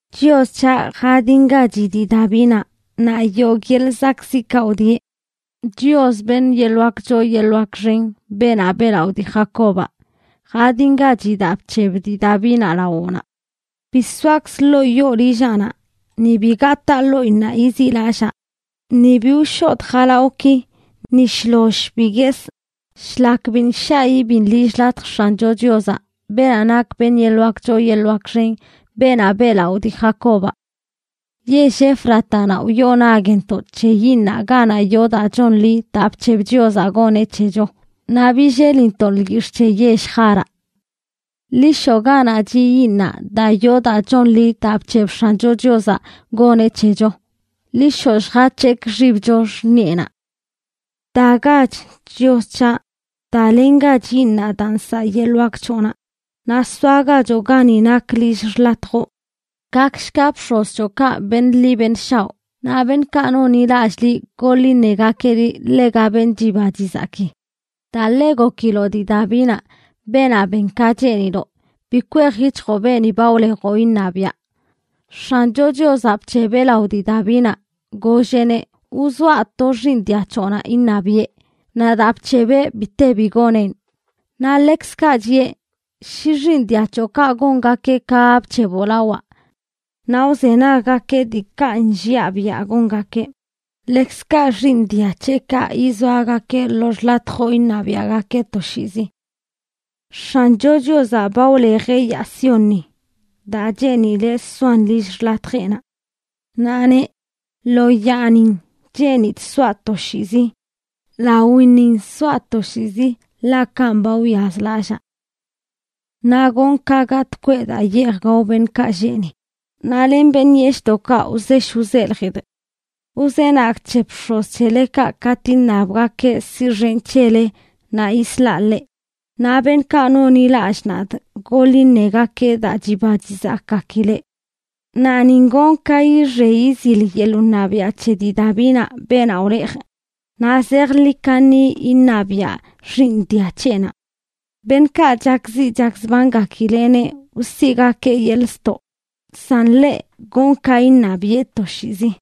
Chios c̱haꞌ, jadingachi dii Davinaꞌ naꞌ yogꞌ yeḻꞌ zakꞌziꞌkaꞌ wdieꞌ. Chios, beṉꞌ yeḻꞌ wak choo yeḻꞌ wak xen, beenaꞌ beꞌlaꞌo dii Jacobaꞌ, jadingachi daa bc̱heb dii Davinaꞌ lawoꞌnaꞌ: “Bi soakzꞌ ḻoo yoo lillaꞌnaꞌ ni bi gataa ḻoꞌinnaꞌ yiziꞌlallaa, ni bi wshodꞌ jalawꞌki, ni shloll bi guesꞌ, shlak biṉꞌ shaꞌ ibiṉ lill xḻatj X̱ancho Chiozaꞌ, beenaꞌ nak beṉꞌ yeḻꞌ wak choo yeḻꞌ wak xen, beenaꞌ beꞌlaꞌo dii Jacobaꞌ.” Yell Éfratanaꞌ wyoo nagntoꞌ c̱he yiiṉaꞌ ganaꞌ yoo daa chonḻi daa bc̱heb Chiozaꞌ goneꞌ c̱hecho, naꞌ billelintoꞌn lyix̱ꞌ c̱he yell Jáaraꞌ. Ḻi shoꞌ ganaꞌ chiꞌ yiiṉaꞌ daa yoo daa chonḻi daa bc̱heb X̱ancho Chiozaꞌ goneꞌ c̱hecho. Ḻi shoꞌ lljac̱hekꞌ xibcho xṉiꞌenaꞌ. Dagach, Chios c̱haꞌ; dalengach yiiṉaꞌ daa nsaꞌ yeḻꞌ wak c̱hoꞌnaꞌ, naꞌ soagachoꞌ gani nak lill xḻatjoꞌ. Gakshga bx̱oz c̱hoꞌkaꞌ beṉꞌ ḻi beṉꞌ shaoꞌ, naꞌ beṉꞌkaꞌ nonḻilallꞌ liꞌ goḻ iṉegakeꞌ liꞌ ḻega beṉꞌ chiba chizaki. Daa ḻe gokiloꞌ dii Davinaꞌ, beenaꞌ ben ka cheeniloꞌ, bi kwej yic̱hjoꞌ beeni ba wlejoꞌ iṉabiaꞌ. X̱ancho Chiozaꞌ bc̱hebeꞌ lao dii Davinaꞌ, golleꞌneꞌ: “Wzoaꞌ to xiiṉ dia c̱hoꞌnaꞌ iṉabiꞌe.” Naꞌ daa bc̱hebeꞌ bi te bi goneꞌn. Naꞌ ḻekzkaꞌ chiꞌe: “Shi xiiṉ dia c̱hoꞌkaꞌ gongakeꞌ ka ba bc̱heboꞌ lawaꞌ, naꞌ wzenaggakeꞌ diikaꞌ nlliaꞌ biaꞌ gongakeꞌ, ḻekzkaꞌ xiiṉ dia c̱heꞌkaꞌ yizoagakeꞌ lo xḻatjoꞌ iṉabiaꞌgakeꞌ toshiizi.” X̱ancho Chiozaꞌ ba wlejeꞌ yaa Siónni, daa cheenileꞌ soan lill xḻatjeꞌnaꞌ. Naꞌ neꞌ: “Lo yaanin cheenidꞌ soaꞌ toshiizi; lawinnin soaꞌ toshiizi, ḻaꞌ kanꞌ ba wyazlallaa. Naꞌ gonꞌ ka gatꞌ kweꞌ daa yeej gao beṉꞌkaꞌ lleꞌ ni, naꞌ len beṉꞌ yeshꞌdoꞌkaꞌ wzesh wzeljidꞌ. Wzenagꞌ c̱he bx̱oz c̱helekaꞌ katꞌ iṉabgakeꞌ siꞌxenꞌ c̱hele naꞌ yislaꞌ leꞌ, naꞌ beṉꞌkaꞌ nonḻilallꞌ nadꞌ goḻ iṉegakeꞌ daa chiba chizakgakileꞌ. Naꞌ nin gonꞌ ka yixe yizil yeḻꞌ wṉabiaꞌ c̱he dii Davinaꞌ, beenaꞌ wlejꞌ, naꞌ zejḻi kaṉi iṉabiaꞌ xiiṉ dia c̱heꞌnaꞌ. Beṉꞌkaꞌ chakziꞌ chakzbangakileꞌneꞌ wsiꞌgakee yeḻꞌ ztoꞌ, san ḻeꞌ, gonꞌ ka iṉabiꞌe toshiizi.”